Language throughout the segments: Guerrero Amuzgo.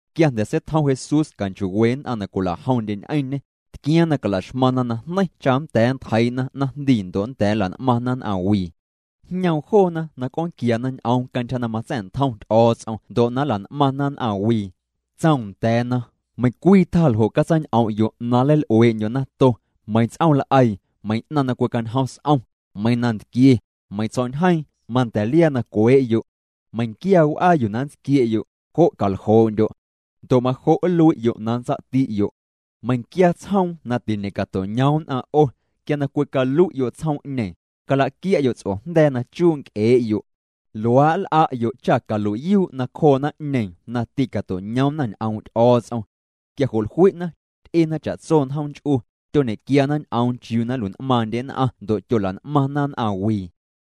Quia jnda̱ seitjom Jesús canchoo'we nn'aⁿ na cwilajomndye ñ'eⁿñê, tquiaaⁿ na cala'xmaⁿna najneiⁿ cha nnda̱a̱ nntjeii'na naⁿjndii, ndo' na nnda̱a̱ nla'n'maⁿna nn'aⁿ wii. Jñoom joona na c'oonquiana ñ'oom cantyja na matsa̱'ntjom Ty'o̱o̱ts'om ndo' na nla'n'maⁿna nn'aⁿwii. Tsoom nda̱a̱na: —Meiⁿcwii tjaa ljo' catsaañ'om'yo' na nleil'uee'ndyo' nato, meiⁿ ts'ooml'eii, meiⁿ 'naⁿ na cwicañjom s'om, meiⁿ nantquie, meiⁿ tsjo̱'ñjeeⁿ, manda̱ liaa na cwee'yo'. Meiⁿnquia w'aa yuu na nntsquie'yo', jo' caljoo'ndyo'. Ndo' majo' nlui'yo' na nntsa'tsa'ti'yo'. Meiⁿnquia tsjoom na tiñe'cato'ñoom nn'aⁿ 'o, quia na cwicalui'yo' tsjoom'ñeeⁿ, calaquia'yo' ts'ojnda̱a̱ na chuu' nc'ee'yo'. Luaa' nl'a'yo' cha calui'yuu' nacjoo naⁿ'ñeeⁿ na tîcato'ñoomna ñ'oom' Ty'o̱o̱ts'om. Quia jo' jlui'na, ty'ena cha'tso njoom nch'u, tyoñe'quiana ñ'oom chiuu na nlui'n'maaⁿndye nn'aⁿ ndo' tyola'n'maⁿna nn'aⁿ wii.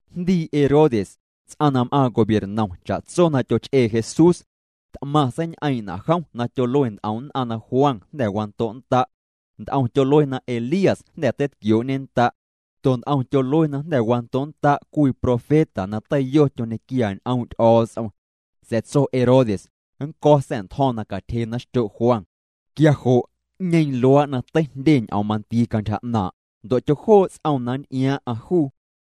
Jndii Herodes, ts'aⁿ na m'aaⁿ gobiernom, cha'tso na tyoch'ee Jesús. T'maⁿ seiñ'eeⁿ'na' jom na tyolue nt'om nn'aⁿ na Juan jnda̱ wando'nnda'. Nt'om tyolue na Elías jnda̱ teitquioo'ñennda'. Ndo' nt'om tyolue na jnda̱ wando'nnda' cwii profeta na teiyo tyoñequia ñ'oom' Ty'o̱o̱ts'om. Sa̱a̱ tso Herodes: —Nnco̱ sa̱'ntjo̱ⁿ na catyjena xtyo' Juan. Quia jo' ¿'ñeeⁿ luaa' na teijndye ñ'oom mandii cantyja 'naaⁿ'? Ndo' tyojoo' ts'oom na nnty'iaaⁿ'aⁿ juu.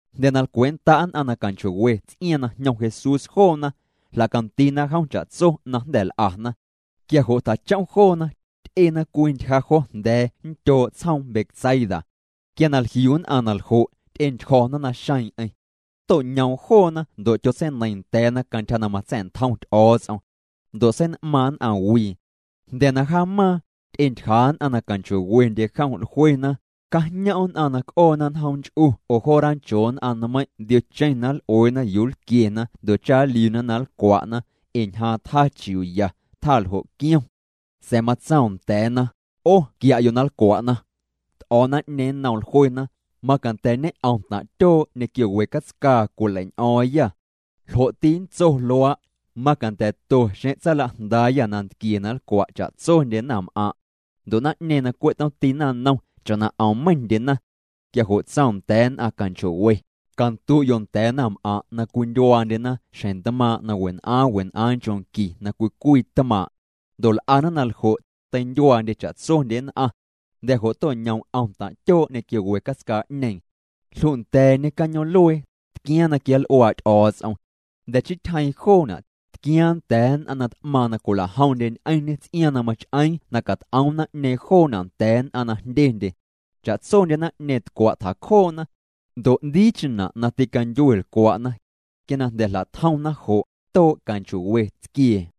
Jnda̱ na lcwee'nnda' nn'aⁿ na canchoo'we ts'iaaⁿ na jñom Jesús joona, jla'candiina jom cha'tso na jnda̱ l'ana. Quia jo' tjachom joona, ty'ena cwii ntyja jo jnda̱a̱ nndyoo' tsjoom Betsaida. Quia na jliu nn'aⁿ na ljo', ty'entyjo̱na naxeeⁿ'eⁿ. To'ñoom joona ndo' tyotseineiiⁿ nda̱a̱na cantyja na matsa̱'ntjom Ty'o̱o̱ts'om. Ndo' sein'maaⁿ nn'aⁿ wii. Jnda̱ na jaamaaⁿ, ty'entyjaa' nn'aⁿ na canchoo'wendye jom. Jluena: —Cajñom' nn'aⁿ na c'oona njoom nch'u oo jo ranchoo nn'aⁿ nmeiⁿ' ndiocheⁿ na nl'ueena yuu nlquiena ndo' cha nliuna na nlcwa'na, ee ñjaaⁿ tjaa chiuuya, tjaa ljo' quiom. Sa̱a̱ matsoom nda̱a̱na: —'O quia'yo' na nlcwa'na. T'o̱o̱ naⁿ'ñeeⁿ nnoom, jluena: —Macanda̱ ñe'om taⁿ' tyoo' ñequio we catscaa cwileiñ'o̱o̱ⁿyâ. ¿Ljo'ti nntso luaa'? Macanda̱to xeⁿ tsaalajndaayâ nantquie na nlcwa' cha'tsondye naⁿm'aⁿ'. Ndo' naⁿ'ñeeⁿ na cwe' tomti naⁿnom, cha'na 'om meiⁿndyena. Quia jo' tsoom nda̱a̱ nn'aⁿ canchoo'we: —Candu'yo' nda̱a̱ naⁿm'aⁿ' na cwindyuaandyena xjeⁿ ntmaaⁿ' na wen'aaⁿ wen'aaⁿ nchoo' qui na cwii cwii tmaaⁿ'. Ndo' l'ana na ljo', teindyuaandye cha'tsondye nn'aⁿ. Jnda̱ jo' to'ñoom 'om taⁿ' tyoo' ñequio we catscaa'ñeeⁿ. Jlunda̱a̱ñê cañoom'luee, tquiaaⁿ na quianl'uaa' Ty'o̱o̱ts'om. Jnda̱ chii tyjeeⁿ joona', tquiaaⁿ nda̱a̱ nn'aⁿ na t'maaⁿ na cwila'jomndye ñ'eⁿñê ts'iaaⁿ na mach'eeⁿ na cat'oom naⁿ'ñeeⁿ joona' nda̱a̱ nn'aⁿ na jndyendye. Cha'tsondye naⁿ'ñeeⁿ tcwa' tjacjoona. Ndo' 'ndiicheⁿna' na tîcandyue lcwa'na. Quia na jnda̱ jla'tjomna jo', too' canchoo'we tsquiee.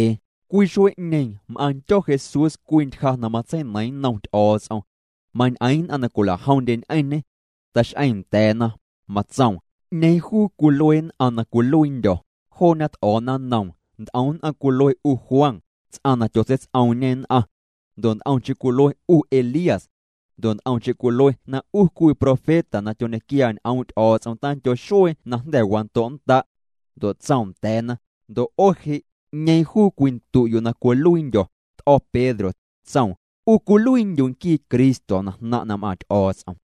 Cwii xuee'ñeeⁿ m'aaⁿndyo̱ Jesús cwii ntyja na matseineiiⁿ nnom Ty'o̱o̱ts'om. Mañ'eeⁿ nn'aⁿ na cwila'jomndye ñ'eⁿñê. Tax'eeⁿ nda̱a̱na, matsoom: —¿'Ñeeⁿ juu cwilue nn'aⁿ na cwiluiindyo̱? Joona t'o̱o̱na nnoom: —Nt'om nn'aⁿ cwilue 'u Juan, ts'aⁿ na tyotseits'oomñe nn'aⁿ. Ndo' nt'omcheⁿ cwilue 'u Elías. Ndo' nt'omcheⁿ cwilue na 'u cwii profeta na tyoñequia ñ'oom' Ty'o̱o̱ts'om tandyo xuee na jnda̱ wando'nnda'. Ndo' tsoom nda̱a̱na: —Ndo' 'o je', ¿'ñeeⁿ juu cwindu'yo' na cwiluiindyo̱? T'o̱ Pedro, tsoom: —'U cwiluiindyu' nquii Cristo na jnaⁿ' na m'aaⁿ Ty'o̱o̱ts'om.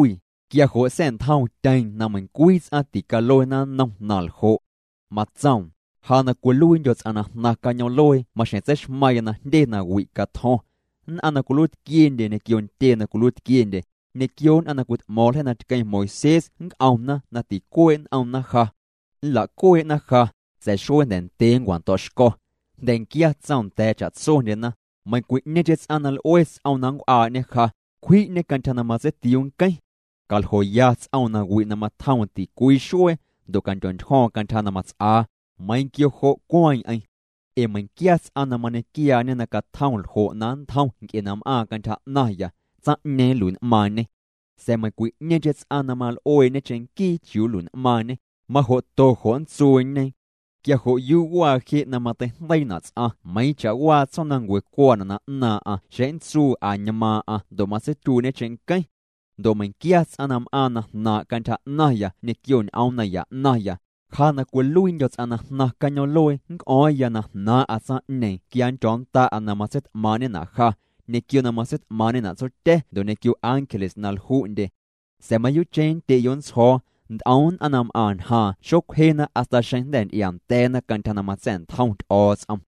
Quia jo' sa̱'ntjoomtyeeⁿ na meiⁿcwii ts'aⁿ ticaluena nnom na ljo'. Matsoom: —Ja na cwiluiindyo̱ ts'aⁿ na jnaⁿ cañoom'luee maxjeⁿ tseixmaⁿya na jndye nawi' catjo̱ⁿ. Nn'aⁿ na cwiluiitquiendye, ñequio ntyee na cwiluiitquiendye, ñequio nn'aⁿ na cwit'mo̱o̱ⁿ ljeii na tqueⁿ Moisés nnc'omna na ticuee' n'omna ja. Nla'cuee'na ja, sa̱a̱ xuee jnda̱ ndyee nncwa'ndo̱'xco̱. Jnda̱nquia tsoom nda̱a̱ cha'tsondyena: —Meiⁿcwi'ñeeⁿcheⁿ ts'aⁿ na l'ue ts'om na nncw'aa'ñe ja, cwji'ñê cantyja na matseitiuu nqueⁿ. Caljoya ts'oom nawi' na matjoom ticwii xuee, ndo' candyontyjo̱o̱ⁿ cantyja na mats'aa, meiiⁿ quio jo' cueeⁿ'eⁿ. Ee meiⁿnquia ts'aⁿ na mañequiaañe na catjom ljo' na nntjom nc'e na m'aaⁿ cantyja 'naⁿya, tsaⁿ'ñeeⁿ nlui'n'maaⁿñê. Sa̱a̱ meiⁿcwi'ñeeⁿcheⁿ ts'aⁿ na mal'uee'ñe cheⁿnquii chiuu nlui'n'maaⁿñê, majo'to jo' nntsuuñe. Quia jo' yuu waa je' na mateijndeiina' ts'aⁿ meiiⁿ cha'waa tsjoomnancue cuaana' na 'naaⁿ'aⁿ xeⁿ nntsuu añmaaⁿ'aⁿ ndo' matseityuii'ñe cheⁿnqueⁿ. Ndo' meiⁿquia ts'aⁿ na m'aaⁿ na jnaaⁿ' cantyja 'naⁿya ñequio ñ'oom naya 'naⁿya, ja na cwiluiindyo̱ ts'aⁿ na jnaⁿ cañoom'luee nc'o̱o̱ⁿya na jnaaⁿ'a tsaⁿ'ñeeⁿ quia nndyo̱o̱nnda'a na matseit'maaⁿ'ñena' ja, ñequio na matseit'maaⁿ'ñena' Tsotya̱ ndo' ñequio ángeles na lju'ndye. Sa̱a̱ mayuu'cheⁿ, nndye'yo' nntsjo̱o̱, nt'om nn'aⁿ na m'aⁿ ñjaaⁿ xocwjena hasta xeⁿ jnda̱ nty'iaanda̱a̱na cantyja na matsa̱'ntjom Ty'o̱o̱ts'om.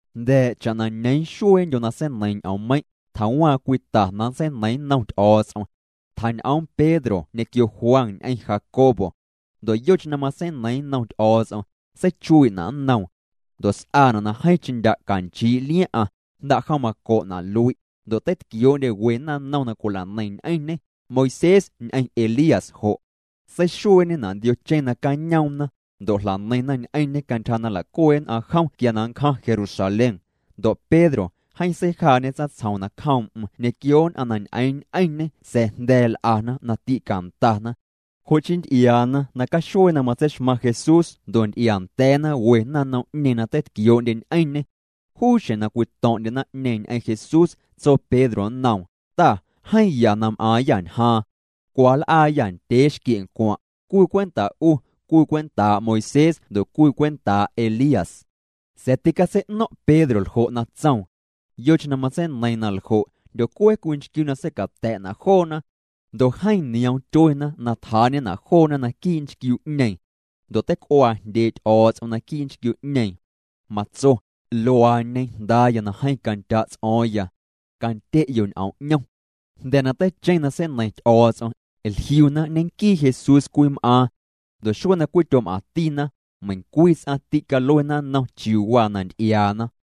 Jnda̱a̱ cha'na ñeeⁿ xueendyo na seineiiⁿ ñ'oommeiⁿ', tjawaaⁿ cwii ta na nntseineiiⁿ nnom Ty'o̱o̱ts'om. Tjañ'oom Pedro ñequio Juan ñ'eⁿ Jacobo. Ndo' yocheⁿ na matseineiiⁿ nnom Ty'o̱o̱ts'om, seichuii'na' nnoom. Ndo' s'aana' na jeeⁿcheⁿ ndya' canchii' liaⁿ'aⁿ, jnda'jom maco'na' lui'. Ndo' teitquioo'ndye we naⁿnom na cwila'neiⁿ ñ'eⁿñê, Moisés ñ'eⁿ Elías jo'. Seixueeñena' ndiocheⁿ nacañoomna, ndo' jla'neiⁿna ñ'eⁿñê cantyja na nla'cuee' nn'aⁿ jom quia na nncjaⁿ Jerusalén. Ndo' Pedro, jeeⁿ seijaa'ñe tsaⁿtsjom nacjoom'm ñequio nn'aⁿ na ñ'eeⁿ ñ'eⁿñê sa̱a̱ jnda̱a̱ l'ana na tîcandana. Jo' chii nty'iaana nacaxuee na matseixmaⁿ Jesús ndo' nty'iaa nda̱a̱na we naⁿnom'ñeeⁿ na teitquioo'ndye ñ'eⁿñê. Juu xjeⁿ na cwito̱ⁿ'ndye naⁿ'ñeeⁿ ñ'eⁿ Jesús, tso Pedro nnoom: —Ta, jeeⁿ ya na m'aaⁿyâ ñjaaⁿ. Cwa nl'aayâ ndyee xquie'ncwaⁿ', cwii cwenta' 'u, cwii cwentaa' Moisés ndo' cwii cwentaa' Elías. Sa̱a̱ ticatsei'no̱ⁿ' Pedro ljo' na tsoom. Yocheⁿ na matseineiiⁿ na ljo', jndyocue cwii nchquiu na seicata̱'na' joona. Ndo' jeeⁿ nioom tyuena na tjaa'ñena' joona naquii' nchquiu'ñeeⁿ. Ndo' teic'uaa jndyee' Ty'o̱o̱ts'om naquii' nchquiu'ñeeⁿ, matso: —Luaañe Jndaaya na jeeⁿ candya' ts'o̱o̱ⁿya. Candye'yo' ñ'oom 'ñom. Jnda̱ na teicheⁿ na seineiⁿ Ty'o̱o̱ts'om, jliuna ñenquii Jesús cwii m'aaⁿ. Ndo' xuee na cwityom'aⁿtina, meiⁿcwii ts'aⁿ tîcaluena nnom chiuu waa na nty'iaana.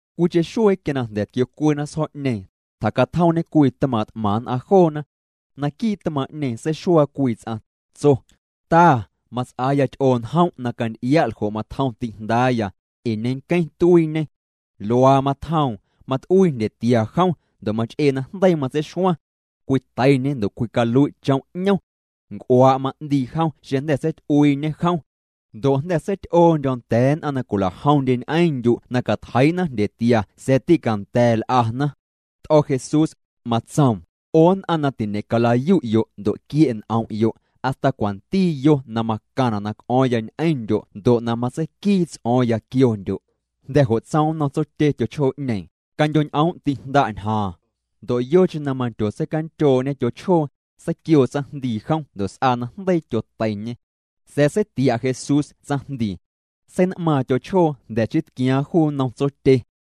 Cwiicheⁿ xuee quia na jnda̱ tquiocuena sjo̱'ñeeⁿ, tjacatjomñe cwii tmaaⁿ' t'maⁿ nn'aⁿ joona. Naquii' tmaaⁿ'ñeeⁿ seixuaa cwii ts'aⁿ, tso: —Ta, mats'aaya ty'oo njom' na canty'ia' ljo' matjom ti'jndaaya, ee ñenqueⁿ tuiiñê. Luaa matjoom, mat'uii jndyetia jom, ndo' mach'ee na jndeii matseixuaⁿ. Cwiteiñê ndo' cwicalui' chom' 'ñom. Nc'uaa' ma'ndii jom xeⁿ jnda̱ seity'uiiñe jom. Ndo' jnda̱ seity'oondyo̱ nda̱a̱ nn'aⁿ na cwila'jomndye ñ'eⁿndyu' na catjeii'na jndyetia sa̱a̱ tîcanda̱a̱ l'ana. T'o̱ Jesús, matsoom: —'O nn'aⁿ na tiñe'cala'yu'yo' ndo' quie' n'om'yo', hasta cwanti yo na macaⁿna' na c'o̱o̱ⁿya ñ'eⁿndyo' ndo' na matseiquii ts'o̱o̱ⁿya quiondyo'. Jnda̱ jo' tsoom nnom tsotye tyochjoo'ñeeⁿ: —Candyo'ñ'oom' ti'jnda' ñjaaⁿ. Ndo' yocheⁿ na mandyotseicandyoo'ñe tyochjoo, seiquioo tsaⁿjndii jom ndo' s'aa na jndeii tyoteiñê. Sa̱a̱ seitia' Jesús tsaⁿjndii. Sein'maaⁿ tyochjoo jnda̱ chii tquiaaⁿ juu nnom tsotye.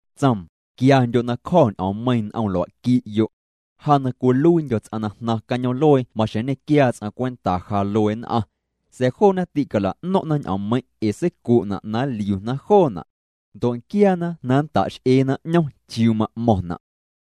Tsoom: —Quiandyo' na cjo̱ ñ'oommeiiⁿ n'om lua'qui'yo'. Ja na cwiluiindyo̱ ts'aⁿ na jnaⁿ cañoom'luee maxjeⁿ nñequiaa ts'aⁿ cwenta ja luee nn'aⁿ. Sa̱a̱ joona tîcala'no̱ⁿ'na ñ'oommeiⁿ' ee seicu'na na nliuna joona'. Ndo' nquiaana na nnta'x'eena 'ñom chiuu ma'mo̱ⁿna'.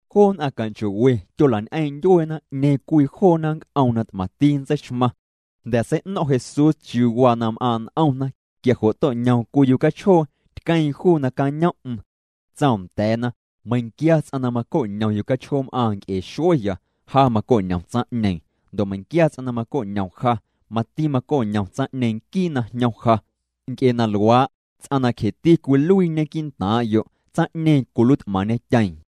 Joo nn'aⁿ canchoo'we tyola'ñ'eeⁿ' ndyueena 'ñeeⁿ cwii joona nnc'oom na t'maⁿti nntseixmaⁿ. Jnda̱ na sei'no̱ⁿ' Jesús chiuu waa na m'aaⁿ' n'omna, quia jo' to'ñoom cwii yucachjoo, tqueeⁿ juu nacañom'm. Tsoom nda̱a̱na: —Meiⁿnquia ts'aⁿ na maco'ñom yucachjoom'aaⁿ nc'e xueya, ja maco'ñom tsaⁿ'ñeeⁿ, ndo' meiⁿnquia ts'aⁿ na maco'ñom ja, mati maco'ñom tsaⁿ'ñeeⁿ nquii na jñom ja. Nc'e na luaa', ts'aⁿ na cjeti cwiluiiñe quii'ntaaⁿ'yo', tsaⁿ'ñeeⁿ cwiluiit'maⁿñetyeeⁿ.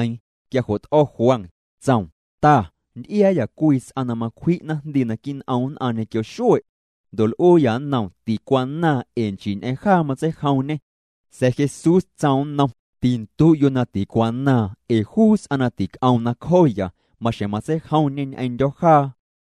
Quia jo' t'o̱ Juan, tsoom: —Ta, nty'iaayâ cwii ts'aⁿ na macwji' naⁿjndii naquii' n'om nn'aⁿ ñequio xue'. Ndo' l'uuyâ nnoom ticwanaaⁿ ee nchii ñ'eⁿ jaa matseijomñê. Sa̱a̱ Jesús tsoom nnom: —Tindu'yo' na ticwanaaⁿ ee juu ts'aⁿ na tic'oom nacjooya, maxjeⁿ matseijomñê ñ'eⁿndyo̱ jaa.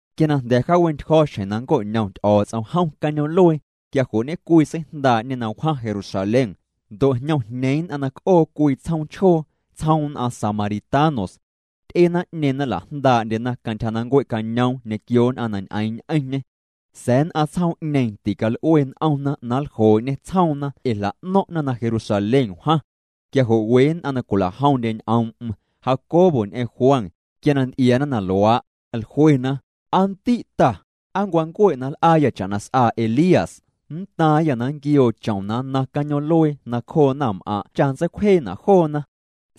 Quia na jnda̱ jaawe'ntyjo̱ xjeⁿ na nnco'ñom Ty'o̱o̱ts'om jom cañoom'luee, quia jo' ñe'cwii seijndaa'ñê na wjaⁿ Jerusalén. Ndo' jñomjñeeⁿ nn'aⁿ na c'oo cwii tsjoom chjoo, tsjoom nn'aⁿ samaritanos. Ty'e naⁿ'ñeeⁿ na nla'jndaa'ndyena cantyja na nncuee'cañoom ñequio nn'aⁿ na ñ'eeⁿ ñ'eⁿñê. Sa̱a̱ nn'aⁿ tsjoom'ñeeⁿ tical'ue n'omna na nljoo'ñê tsjoomna ee jla'no̱ⁿ'na na Jerusalén wjaⁿ. Quia jo' we nn'aⁿ na cwila'jomndye ñ'oom'm, Jacobo ñ'eⁿ Juan, quia na nty'iaana na luaa', jluena: —Aa ndi' Ta, ¿aa nncwancue' na nl'aayâ cha'na s'aa Elías? Nntaaⁿyâ na quioo chom na nnaⁿ cañoom'luee nacjoo naⁿm'aⁿ' cha nntseicwjeena' joona.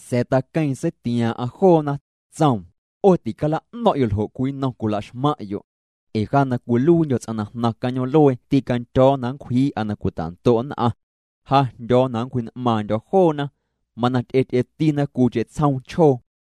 Sa̱a̱ jom taqueeⁿ, seitiaaⁿ'aⁿ joona, tsoom: —'O ticala'no̱ⁿ'yo' ljo' cwii nnom cwilaxmaⁿ'yo'. Ee ja na cwiluiindyo̱ ts'aⁿ na jnaⁿ cañoom'luee tîcandyo̱o̱ na nncwjii'a na cwita'ndo' nn'aⁿ. Ja jndyo̱o̱ na nncwji'n'maaⁿndyo̱ joona. Mana ty'ety'etina cwiicheⁿ tsjoom chjoo.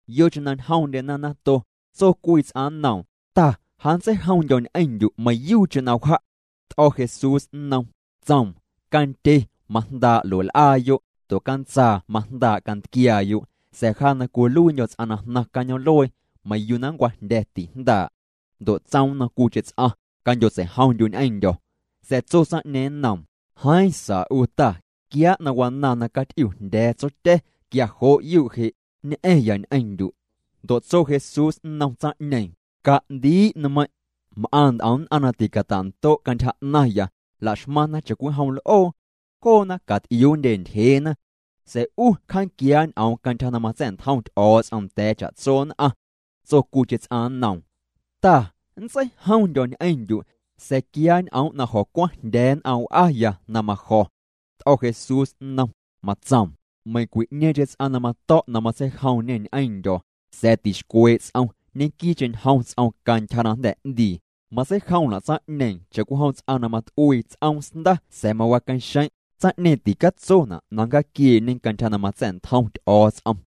Yocheⁿ na ñjomndyena nato, tso cwii ts'aⁿ nnoom: —Ta, ja nntseijomndyo̱ ñ'eⁿndyu' meiⁿyuucheⁿ na wja'. T'o̱ Jesús nnom, tsoom: —Candye majndaa' lue'l'aayo', ndo' cantsaa majndaa' cantquiaayo', sa̱a̱ ja na cwiluiindyo̱ ts'aⁿ na jnaⁿ cañoom'luee, meiⁿ yuu na nncwajndya̱, tijndaa'. Ndo' tsoom nnom cwiicheⁿ ts'aⁿ: —Candyotseijomndyu' ñ'eⁿndyo̱. Sa̱a̱ tso tsaⁿ'ñeeⁿ nnoom: —Jeeⁿ sa 'u Ta, quiaa' na wanaaⁿ na caty'iujndya̱a̱ tsotya̱, quia jo' yuu' je', nñ'a̱ⁿya ñ'eⁿndyu'. Ndo' tso Jesús nnom tsaⁿ'ñeeⁿ: —Ca'ndii' nmeiⁿ'. M'aⁿ nt'om nn'aⁿ na ticata'ndo' cantyja 'naⁿya, la'xmaⁿna cha'cwijom l'oo. Joona caty'iuundye ntyjeena. Sa̱a̱ 'u cja'quiaa' ñ'oom cantyja na matsa̱'ntjom Ty'o̱o̱ts'om nda̱a̱ cha'tso nn'aⁿ. Tso cwiicheⁿ ts'aⁿ nnoom: —Ta, nntseijomndyo̱ ñ'eⁿndyu', sa̱a̱ quiaa' ñ'om' na jo̱cwaⁿjndya̱a̱ nn'aⁿ w'aya na majo̱. T'o̱ Jesús nnom, matsoom: —Meiⁿcwi'ñeeⁿcheⁿ ts'aⁿ na mato̱' na matseijomñe ñ'eⁿndyo̱, a̱a̱ tixcwee' ts'om, ñenquii'cheⁿ ñjom ts'om cantyja na jnda̱ 'ndii, matseijomna' tsaⁿ'ñeeⁿ cha'cwijom ts'aⁿ na mat'uii ts'oomsnda sa̱a̱ mawaqueⁿxeⁿ', tsaⁿ'ñeeⁿ ticatsona' na nncjaaquiee'ñe cantyja na matsa̱'ntjom Ty'o̱o̱ts'om.